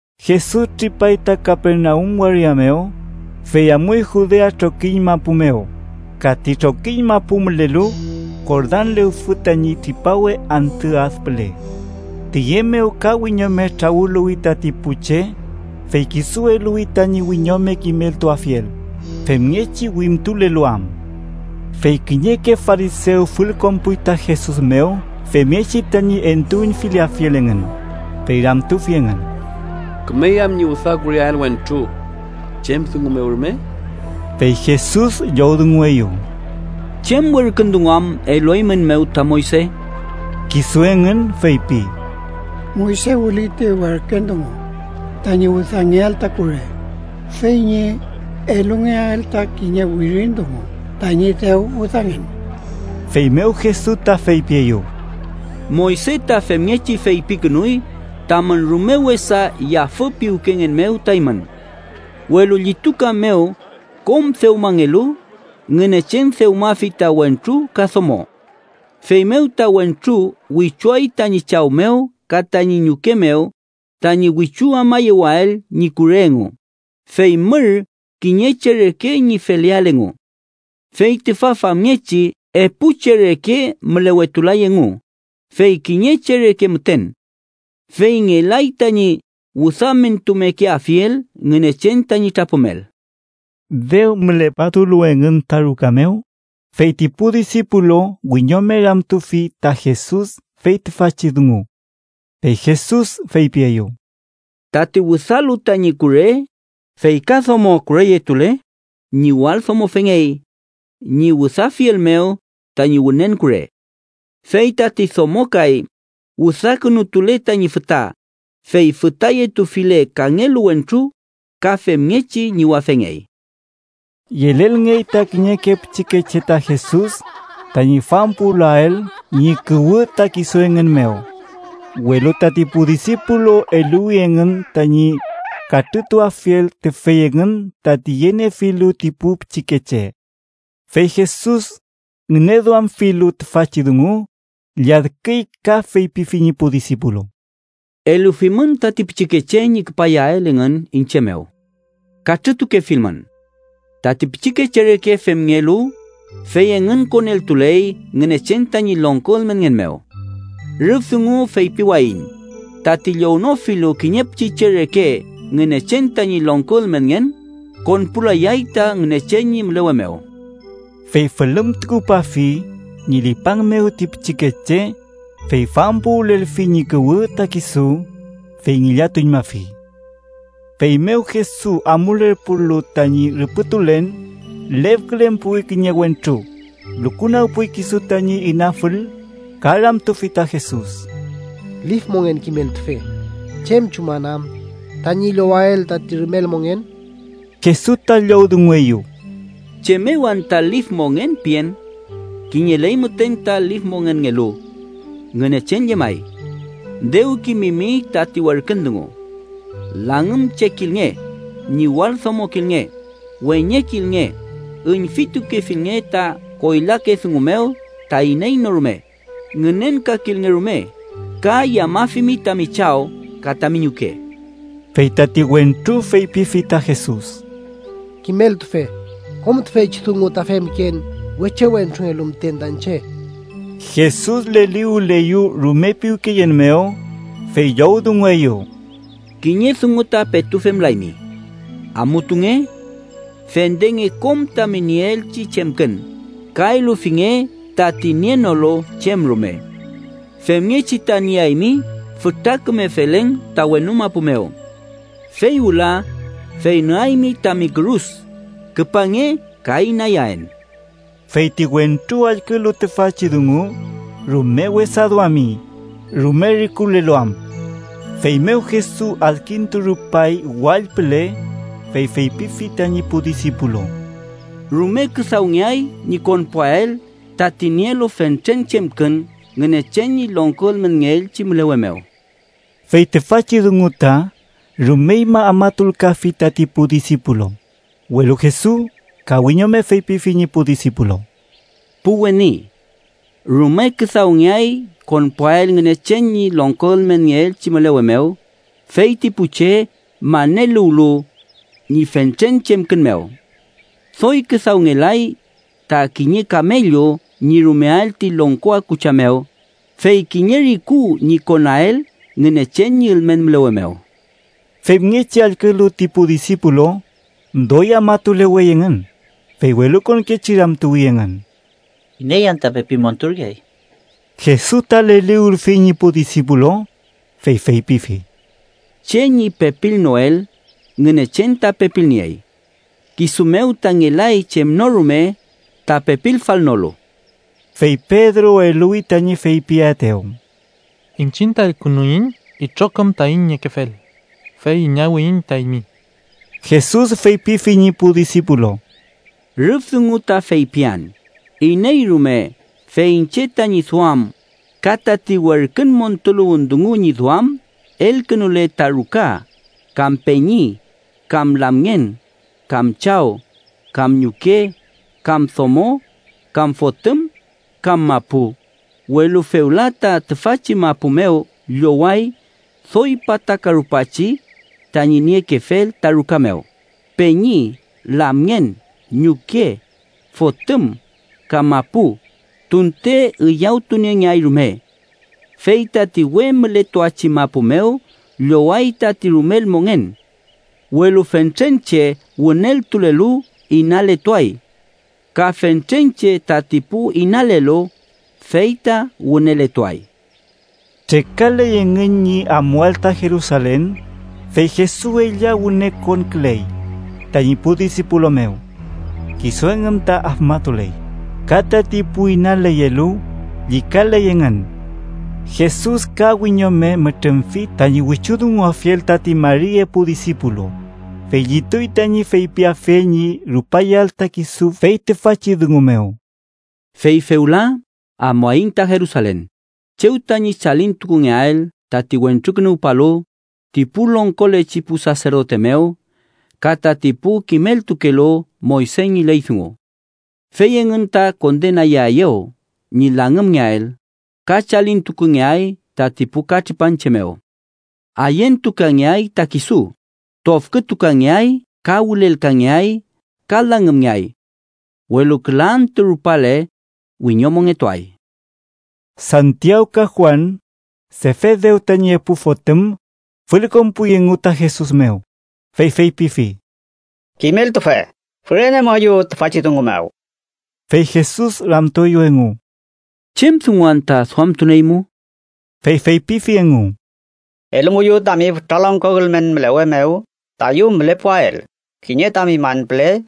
Jesus tripay ta Kapernaum waria mew, fey amuy Judea trokiñ mapu mew ka ti trokiñ mapu mülelu Jordan lewfü tañi tripawe antü ad püle. Tiye mew ka wiñome trawüluwi tati pu che, fey kisu eluwi tañi wiñome kimeltuafiel, femngechi wimtulelu am. Fey kiñeke farisew fülkonpuy ta Jesus mew femngechi tañi entuüñfilafiel engün, fey ramtufi engün: —¿Kümey am ñi wüdakureael wentru chem dungu mew rume? Fey Jesus llowdungueyew: —¿Chem werkün dungu am elueymünmew ta Moyse? Kisu engün feypi: —Moyse wüli ti werkün dungu tañi wüdangeael ta kure fey ñi elungeael ta kiñe wirin dungu tañi dew wüdangen. Feymew Jesus ta feypieyew: —Moyse ta femngechi feypikünuy tamün rume wesa yafü piwkengen mew ta eymün. Welu llituka mew kom dewmangelu, ‘Ngünechen dewmafi ta wentru ka domo.’ ‘Feymew ta wentru wichuay tañi chaw mew ka tañi ñuke mew tañi wichu amayewael ñi kure engu, fey mür kiñe che reke ñi feleael engu.’ Fey tüfa famngechi epu che reke mülewetulay engu, fey kiñe che reke müten. Fey ngelay tañi wüdamentumekeafiel Ngünechen tañi trapümel. Dew müleputulu engün ta ruka mew, fey ti pu disipulu wiñome ramtufi ta Jesus fey tüfachi dungu. Fey Jesus feypieyew: —Tati wüdalu tañi kure fey ka domo kureyetule, ñiwaldomofengey ñi wüdafiel mew tañi wünen kure. Fey tati domo kay wüdakünutule tañi füta, fey fütayetufile kangelu wentru, ka femngechi ñiwafengey. Yelelngey ta kiñeke pichikeche ta Jesus tañi fampuwülael ñi kuwü ta kisu engün mew, welu tati pu disipulu eluwi engün tañi katrütuafiel tüfey engün tati yeniefilu ti pu pichikeche. Fey Jesus, ngüneduamfilu tüfachi dungu, lladküy ka feypifi ñi pu disipulu: —Elufimün tati pichikeche ñi küpayael engün iñche mew. Katrütukefilmün. Tati pichikeche reke femngelu, fey engün koneltuley Ngünechen tañi longko ülmenngen mew. Rüf dungu feypiwayiñ tati llownofilu kiñe pichiche reke Ngünechen tañi longko ülmenngen, konpulayay ta Ngünechen ñi mülewe mew. Fey fülümtukupafi ñi lipang mew ti pichikeche, fey fampuwülelfi ñi kuwü ta kisu, fey ngillatuñmafi. Feymew Jesus amulerpulu tañi rüpütulen, lefkülen puwi kiñe wentru, lukunagpuy kisu tañi inafül ka ramtufi ta Jesus: —Lif mongen kimeltufe, ¿chem chuman am tañi llowael tati rumel mongen? Jesus ta llowdungueyew: —¿Chem mew anta lif mongen pien? Kiñeley müten ta lif mongenngelu: Ngünechen llemay. Dew kimimi tati werkün dungu: ‘Langümchekilnge, ñiwaldomokilnge, weñekilnge, üñfitukefilnge ta koylake dungu mew ta iney no rume, ngünenkakilnge rume, ka yamafimi tami chaw ka tami ñuke.’ Fey tati wentru feypifi ta Jesus: —Kimeltufe, kom tüfeychi dungu ta femken wechewentrungelu müten ta iñche. Jesus leliwüleyew rume piwkeyen mew, fey llowdungueyew: —Kiñe dungu ta petu femlaymi. Amutunge. Fendenge kom tami nieelchi chemkün ka elufinge tati nienolu chem rume. Femngechi ta nieaymi fütra küme felen ta wenu mapu mew. Fey wüla, fey nüaymi tami kürus, küpange ka inayaen. Fey ti wentru allkülu tüfachi dungu, rume wesa duami, rume rikulelu am. Feymew Jesus adkinturupay wall püle, fey feypifi tañi pu disipulu: —¡Rume küdawngeay ñi konpuael tati nielu fentren chemkün Ngünechen ñi longko ülmenngeelchi mülewe mew! Fey tüfachi dungu ta rumeñma afmatulkafi tati pu disipulu, welu Jesus ka wiñome feypifi ñi pu disipulu: —Pu weni, ¡rume küdawngey konpuael Ngünechen ñi longko ülmenngeelchi mülewe mew, feyti pu che maneluwlu ñi fentren chemkün mew! Doy küdawngelay ta kiñe kamellu ñi rumeael ti longko akucha mew, fey kiñe riku ñi konael Ngünechen ñi ülmen mülewe mew. Femngechi allkülu ti pu disipulu, doy afmatulewey engün, fey welukonkechi ramtuwi engün: —¿Iney anta pepi monturkeay? Jesus ta leliwülfi ñi pu disipulu, fey feypifi: —Che ñi pepilnoel, Ngünechen ta pepilniey. Kisu mew ta ngelay chem no rume ta pepilfalnolu. Fey Pedro eluwi tañi feypiaetew: —Iñchiñ ta elkünuiñ itrokom taiñ niekefel, fey inawiyiñ ta eymi. Jesus feypifi ñi pu disipulu: —Rüf dungu ta feypian iney rume fey iñche tañi duam ka tati werkün montuluwün dungu ñi duam elkünule ta ruka, kam peñi, kam lamngen, kam chaw, kam ñuke, kam domo, kam fotüm, kam mapu, welu fewla ta tüfachi mapu mew lloway doy pataka rupachi tañi niekefel ta ruka mew, peñi, lamngen, ñuke, fotüm ka mapu, tunte üyawtuniengeay rume. Fey tati we mületuachi mapu mew lloway tati rumel mongen. Welu fentren che wüneltulelu, inaletuay. Ka fentren che tati pu inalelu, fey ta wüneletuay. Trekaley engün ñi amuael ta Jerusalen, fey Jesus ella wüne konküley tañi pu disipulu mew. Kisu engün ta afmatuley, ka tati pu inaleyelu llükaley engün. Jesus ka wiñome mütrümfi tañi wichudunguafiel tati mari epu disipulu, fey llituy tañi feypiafiel ñi rupayael ta kisu fey tüfachi dungu mew: “Fey fewla amuaiñ ta Jerusalen, chew tañi chalintukungeael tati Wentrukünuwpalu ti pu longkolechi pu saserdote mew ka tati pu kimeltukelu Moyse ñi ley dungu. Fey engün ta kondenayaeyew ñi langümngeael ka chalintukungeay tati pu katripanche mew. Ayentukangeay ta kisu, tofkütukangeay ka wülelkangeay ka langümngeay. Welu küla antü rupale, wiñomongetuay.” Santiaw ka Juan, Sefedew tañi epu fotüm, fülkonpuy engu ta Jesus mew, fey feypifi: —Kimeltufe, fürenemuayu tüfachi dungu mew. Fey Jesus ramtueyew engu: —¿Chem dungun anta duamtunieymu? Fey feypifi engu: —Elumuyu tami fütra longko ülmen mülewe mew tayu mülepuael kiñe tami man püle,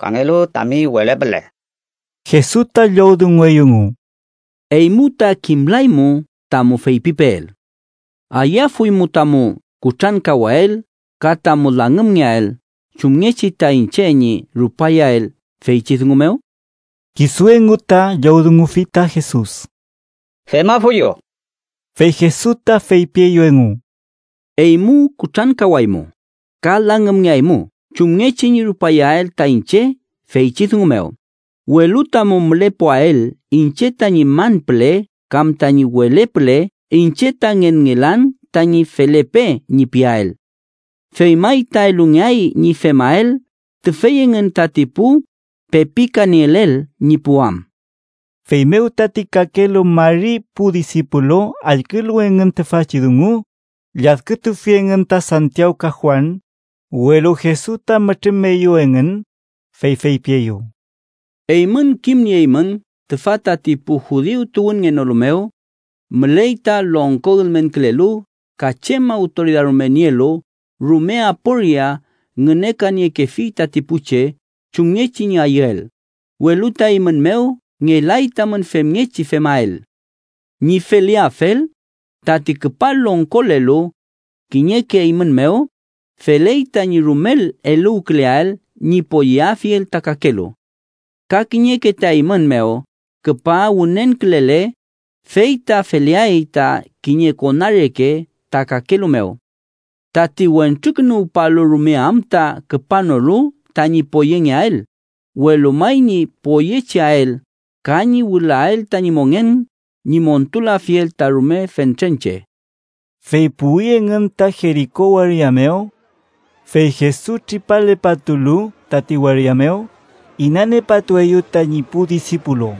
kangelu tami wele püle. Jesus ta llowdungueyew engu: —Eymu ta kimlaymu tamu feypipeel. ¿Ayüafuymu tamu kutrankawael ka tamu langümngeael chumngechi ta iñche ñi rupayael feychi dungu mew? Kisu engu ta llowdungufi ta Jesus: —Femafuyu. Fey Jesus ta feypieyew engu: —Eymu kutrankawaymu ka langümngeaymu chumngechi ñi rupayael ta iñche feychi dungu mew, welu tamu mülepuael iñche tañi man püle kam tañi wele püle iñche ta ngenngelan tañi ‘felepe’ ñi piael. Fey may ta elungeay ñi femael tüfey engün tati pu pepikanielel ñi puwam. Feymew tati kakelu mari pu disipulu allkülu engün tüfachi dungu, lladkütufi engün ta Santiaw ka Juan, welu Jesus ta mütrümeyew engün, fey feypieyew: —Eymün kimnieymün tüfa tati pu judiu tuwünngenolu mew müley ta longko ülmenkülelu ka chem awtoridad rume nielu rume aporia ngünekaniekefi tati pu che chumngechi ñi ayüel, welu ta eymün mew ngelay tamün femngechi femael. Ñi feleafel, tati küpa longkolelu kiñeke eymün mew, feley tañi rumel eluwküleael ñi poyeafiel ta kakelu. Ka kiñeke ta eymün mew küpa wünenkülele, fey ta feleay ta kiñe kona reke ta kakelu mew. Tati Wentrukünuwpalu rume am ta küpanolu tañi poyengeael, welu may ñi poyecheael ka ñi wülael tañi mongen ñi montulafiel ta rume fentren che. Fey puwi engün ta Jeriko waria mew. Fey Jesus tripalepatulu tati waria mew, inaniepatueyew tañi pu disipulu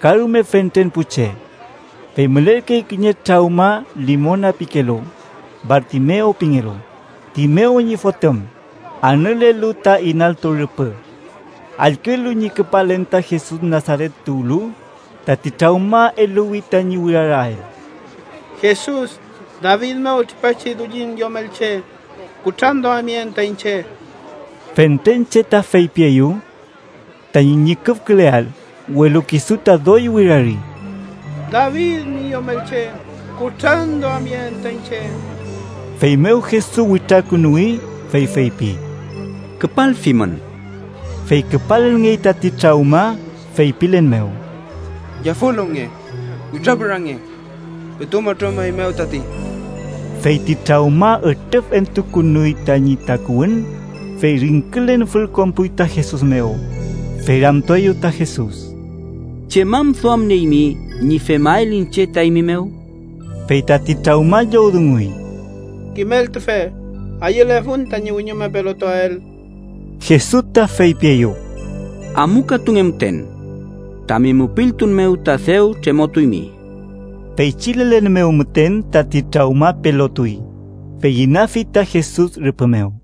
ka rume fentren pu che. Fey mülerkey kiñe trawma limona pikelu, Bartimew pingelu, Timew ñi fotüm, anülelu ta inaltu rüpü. Allkülu ñi küpalen ta Jesus Nasaret tuwlu, tati trawma eluwi tañi wirarael: —¡Jesus, David mew tripachi Dullin Yomelche, kutranduamyeen ta iñche! Fentren che ta feypieyew tañi ñüküfküleael, welu kisu ta doy wirari: —¡David ñi Yomelche, kutranduamyeen ta iñche! Feymew Jesus witrakünuwi, fey feypi: —Küpalfimün. Fey küpalngey tati trawma, feypilen mew: —Yafüluwnge. Witrapürange. Petu mütrümeymew tati. Fey ti trawma ütrüfentukünuy tañi takuwün, fey ringkülen fülkonpuy ta Jesus mew, fey ramtueyew ta Jesus: —¿Chem am duamnieymi ñi femael iñche ta eymi mew? Fey tati trawma llowdunguy: —Kimeltufe, ayülefun tañi wiñome pelotuael. Jesus ta feypieyew: —Amukatunge müten. Tami mupiltun mew ta dew tremotuymi. Feychi lelen mew müten tati trawma pelotuy, fey inafi ta Jesus rüpü mew.